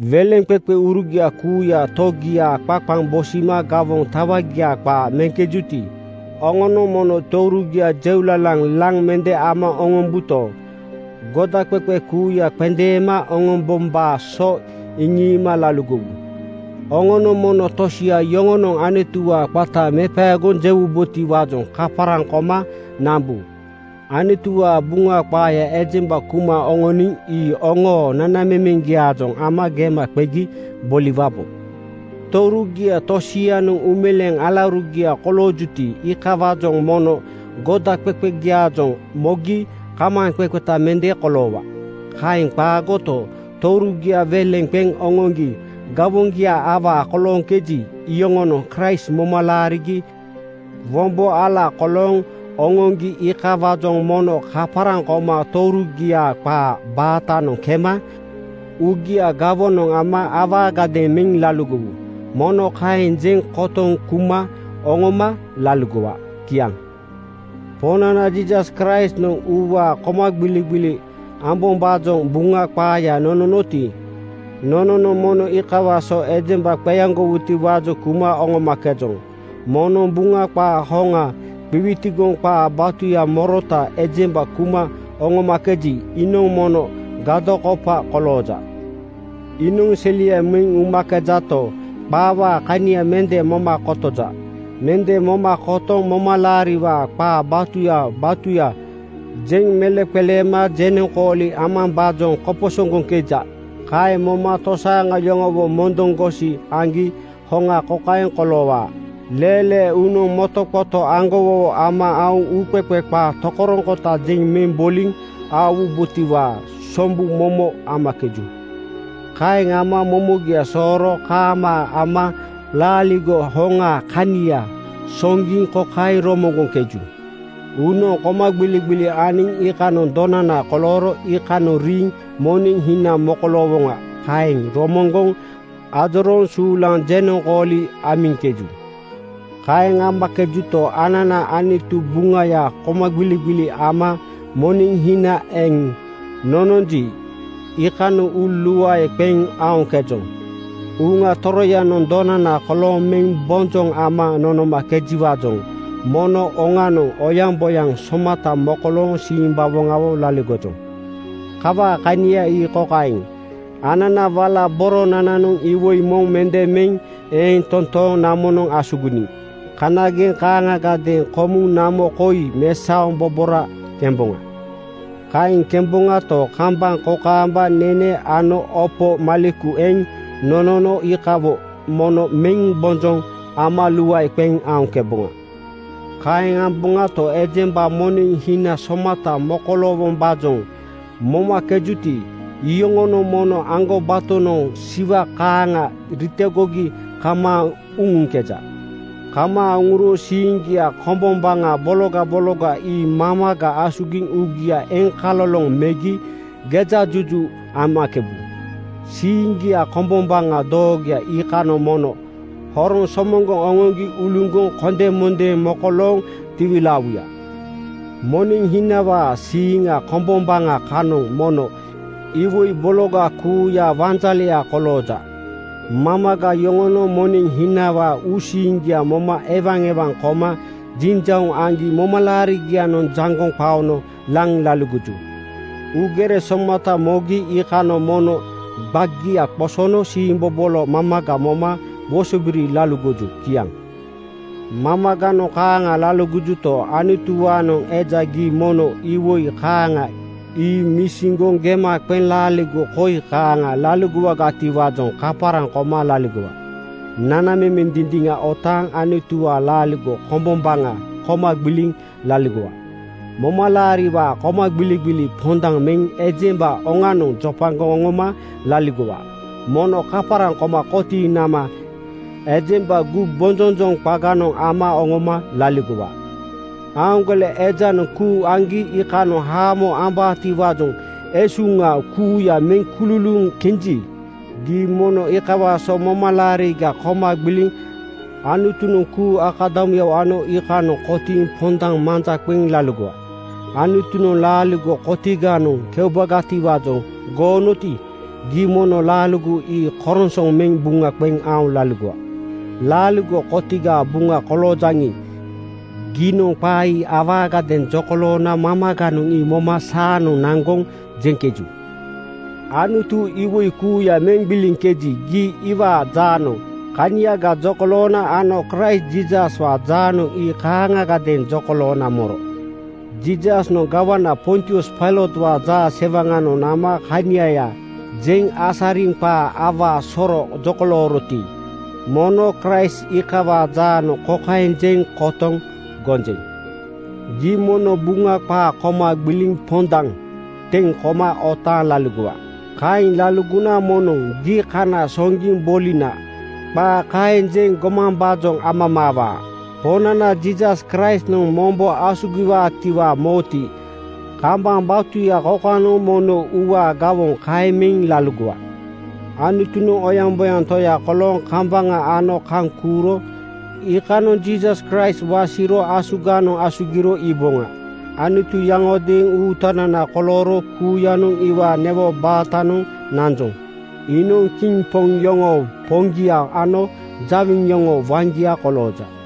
Weleŋqeqeurugia kuuya togiaa qaqaŋ bosima gawoŋ tawagia qaa meŋkejuti, oŋonoŋ mono tourugia jeulalaŋ laŋ mende ama oŋombuto, godaqeqe kuuya qendeema oŋombombaa so iŋiima laligowu. Oŋonoŋ mono tosia yoŋonoŋ Anutuwaa qata mepaegoŋ jewubotiwaajoŋ kaparaŋ koma nambu. Anutuwaa Buŋa qaaya ejemba kuma oŋoniŋ ii oŋoo nanamemeŋgiaajoŋ ama gema qegi boliwabo. Tourugia tosianoŋ uumeleeŋ alaurugia koloojuti, iikawaajoŋ mono godaqeqegiaajoŋ mogi kamaaŋqeqeta mende koloowa. Kaeŋ qaagoto, tourugia weleŋ qeŋ oŋoŋgi gawoŋgia awaa kolooŋkeji, iyoŋonoŋ Kraist moma laarigi wombo ala kolooŋ oŋoŋgi iikawaajoŋ mono kaparaŋ koma tourugiaa qaa baatanoŋ kema uugia gawonoŋ ama awaagadeeŋ meŋ laligowu. Mono kaeŋ jeŋ kotoŋ kuma oŋoma laligowa. Kiaŋ. Poŋnana Jiisas Kraistnoŋ uuwaa komagbiligbili ambombaajoŋ Buŋa qaaya nononoti, nononoŋ mono iikawaa so ejemba qeaŋgowutiwaajoŋ kuma oŋomakejoŋ. Moŋnoŋ Buŋa qaa hoŋa qiwitigoŋ qaa batuya morota ejemba kuma oŋomakeji, iinoŋ mono gadokopa kolooja. Iinoŋ selia meŋ umakejato, qaawaa kania mende moma kotoja. Mende moma kotoŋ momalaariwaa qaa batuya batuya jeŋ meleŋqeleema jenoŋkooli ambombaajoŋ koposoŋgoŋkeja. Kaeŋ moma tosaaŋa yoŋowo mondoŋgosi aŋgi hoŋa kokaeŋ koloowaa: Leelee uunoŋ motoqoto aŋgowowo ama aoŋ uuqeqe qaa tokoroŋkota jeŋ meŋ boliŋ aowubotiwaa sombu momo amakeju. Kaeŋ ama momogia sooro kaamaa ama laaligo hoŋaa kania soŋgiŋ kokaeŋ romoŋgoŋkeju: ‘Uunoŋ komagbiligbili aniŋ iikanoŋ donana kolooro iikanoŋ riiŋ moneŋ hina mokoloowoŋa’ Kaeŋ romoŋgoŋ ajorooŋ suulaŋ jenoŋkooli amiŋkeju. Kaeŋ amakejuto, anana Anutu Buŋayaa komagbiligbili ama moneŋ hina eŋ nononji, iikanoŋ uu luae qeŋ aoŋkejoŋ. Uŋa Toroyanoŋ donana kolooŋ meŋ bonjoŋ ama nonomakejiwaajoŋ mono oŋanoŋ oyaŋboyaŋ somata mokolooŋ simbawoŋawo laligojoŋ. Kawaa kania ii kokaeŋ: Anana wala boronananoŋ iwoi moŋ mende meŋ eeŋ toontooŋ namonoŋ asuginiŋ. Kanageŋ kaaŋagadeeŋ komuŋ namo koi mesaoŋ bobora kemboŋa. Kaeŋ kemboŋato, kambaŋ kokaamba nene ano opo maleku eŋ nonono iikawo mono meŋ bonjoŋ ama luae qeŋ aoŋkeboŋa. Kaeŋ amboŋato, ejemba moneŋ esuhina somata mokoloowombaajoŋ momakejuti, iyoŋonoŋ mono aŋgobatonoŋ siwa kaaŋa ritogogi kamaaŋ uŋuŋkeja. Kamaaŋ uŋuro siiŋgia kombombaŋa bologa bologa ii mamaga asugiŋ uugia eŋkaloloŋ megi gejajuju amakebu. Siiŋgia kombombaŋa doogoya iikanoŋ mono horoŋ somoŋgoŋ oŋoŋgi uluŋgoŋ kondemondeeŋ mokolooŋ tiwilaawuya. Moneŋ hinawaa siiŋ kombombaŋa kanoŋ mono iwoi bologa kuuyaa wanjaleya kolooja. Mamaga yoŋonoŋ moneŋ hinawaa uusiiŋgia moma ewaewaŋ koma jinjauŋ aŋgi momalaarigianoŋ jaŋgoŋ qaono laŋ laligoju. Uugere somata mogi iikanoŋ mono gbagia qosono siimbobolo mamaga moma wosobiri laligoju. Kiaŋ. Mamaganoŋ kaaŋa laligojuto, Anutuwaanoŋ eja gii mono iwoi kaaŋa ii misiŋgoŋ gema qeŋ laaligo koi kaaŋa laligowagatiwaajoŋ kaparaŋ koma laligowa: Nanamemeŋ dindiŋa otaaŋ Anutuwaa laaligo kombombaŋa koma gbiliŋ laligowa. Momalaariwaa komagbiligbili pondaŋ meŋ ejemba oŋanoŋ jopagoŋ oŋoma laligowa. Mono kaparaŋ koma kotiiŋ nama ejemba gumbonjonjoŋ qaganoŋ ama oŋoma laligowa. Aaŋgole ejanoŋ kuu aŋgi iikanoŋ haamo ambaatiwaajoŋ esuŋa kuuya meŋ kululuuŋ kenji, gii mono iikawaa so momalaariga koma gbiliŋ Anutunoŋ kuu akadamuyawo ano iikanoŋ kotiiŋ pondaŋ manja qeŋ laligowa. Anutunoŋ laaligo kotiganoŋ keubagatiwaajoŋ goonoti, gii mono laaligo ii koronsoŋ meŋ buŋa qeŋ aoŋ laligowa. Laaligo kotigaa buŋa koloojaŋi, giinoŋ qaa ii awaagadeeŋ jokoloona mamaganoŋ ii moma saanoŋ naŋgoŋ jeŋkeju. Anutu iwoi kuuya meŋ gbiliŋkeji, gii iwaa jaanoŋ kaniaga jokoloona ano Kraist Jiisaswaa jaanoŋ ii kaaŋagadeeŋ jokoloona moro. Jiisasnoŋ gawana Pontius Pailotwaa jaasewaŋanoŋ nama kaniaya jeŋ asariŋ qaa awaa soro jokolooroti, mono Kraist iikawaa jaanoŋ kokaeŋ jeŋ kotoŋ gonjeŋ: Gii mono Buŋa qaa koma gbiliŋ pondaŋ teŋ koma otaaŋ laligowa. Kaeŋ laligona moŋnoŋ “Gii kana soŋgiŋ bolina,” qaa kaeŋ jeŋ gomambaajoŋ amamaawaa. Poŋnana Jiisas Kraistnoŋ mombo asugiwaatiwaa moti, kambaŋ batuya kokanoŋ mono uuwaa gawoŋ kaeŋ meŋ laligowa. Anutunoŋ oyaŋboyaŋ Toya kolooŋ kambaŋa ano kaŋ kuuro iikanoŋ Jiisas Kraist wasiro asuganoŋ asugiro iiboŋa. Anutu yaŋodeeŋ Uutanana kolooro kuuyanoŋ iwaa newo baatanoŋ nanjoŋ. Iinoŋ kiŋ poŋ yoŋoo Poŋgia ano jawiŋ yoŋoo waŋgia kolooja.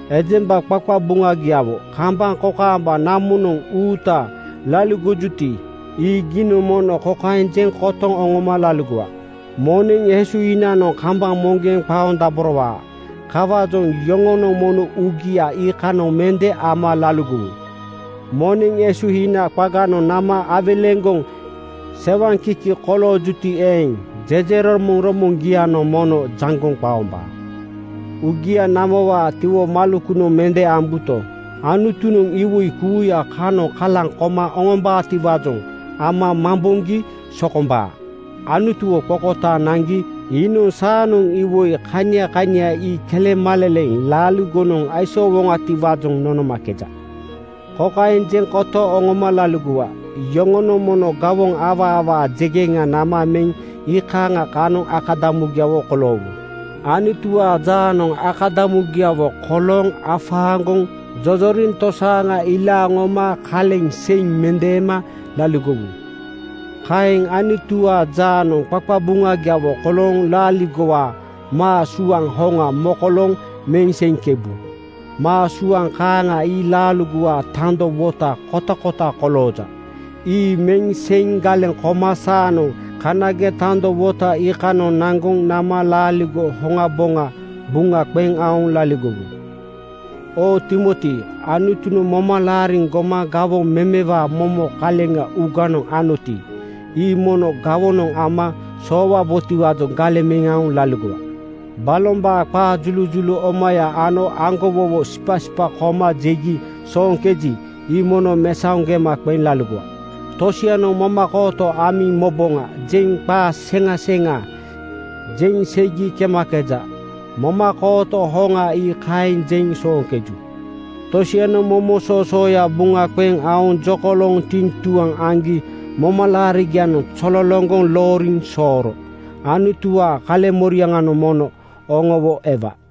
Ejemba qaqabuŋagiawo kambaŋ kokaamba namonoŋ uuta laligojuti, ii giinoŋ mono kokaeŋ jeŋ kotoŋ oŋoma laligowa: Moneŋ esuhinanoŋ kambaŋ moŋgeŋ qaondaborowaa. Kawaajoŋ yoŋonoŋ mono uugia iikanoŋ mende ama laligowu. Moneŋ esuhina qaganoŋ nama awelegoŋ sewaŋkiki koloojuti eeŋ, jejeromoŋromoŋgianoŋ mono jaŋgoŋ qaombaa. Uugia namowaa tiwomalekunoŋ mende ambuto, Anutunoŋ iwoi kuuya kanoŋ kalaŋ koma oŋombaatiwaajoŋ ama mamboŋgi sokombaa. Anutuwo qokotaaŋ naŋgi iinoŋ saanoŋ iwoi kania kania ii kelemaleleŋ laaligonoŋ aisoowoŋiwaajoŋ nonomakeja. Kokaeŋ jeŋ kotoŋ oŋoma laligowa: Yoŋonoŋ mono gawoŋ awaa awaa jegeŋa nama meŋ iikaaŋa kanoŋ akadamugiawo koloowu. Anutuwaa jaanoŋ akadamugiawo kolooŋ afaaŋgoŋ jojoriŋtosaaŋa ilaaŋ oŋoma kaleŋ seiŋ mendeema laligowu. Kaeŋ Anutuwaa jaanoŋ qaqabuŋagiawo kolooŋ laaligowaa maa suaŋ hoŋa mokolooŋ meŋ seiŋkebu. Maa suaŋ kaaŋa ii laaligowaa tando wota kotakota kolooja. Ii meŋ seiŋ galeŋ koma saanoŋ kanageŋ tando wota iikanoŋ naŋgoŋ nama laaligo hoŋaboŋa buŋa qeŋ aoŋ laligowu. Oo Timoti, Anutunoŋ moma laariŋ goma gawoŋ memewaa momo kaleŋ uuganoŋ anoti, ii mono gawonoŋ ama soowaboti-waajoŋ galeŋ meŋ laligowa. Balombaa qaa julujulu omaya ano aŋgowowo sipasipa koma jegi sooŋkeji, ii mono mesaoŋ gema qeŋ laligowa. Tosianoŋ “Momakooto amiŋ moboŋa,” jeŋ qaa seŋa seŋa jeŋ seigi kemakeja. Momakooto hoŋa ii kaeŋ jeŋ sooŋkeju. Tosianoŋ momo soosooya buŋa qeŋ aoŋ jokolooŋ tiŋtuaŋ aŋgi momalaarigianoŋ zololoŋgoŋ looriŋ sooro. Anutuwaa kaleŋmoriaŋanoŋ mono oŋowo ewa.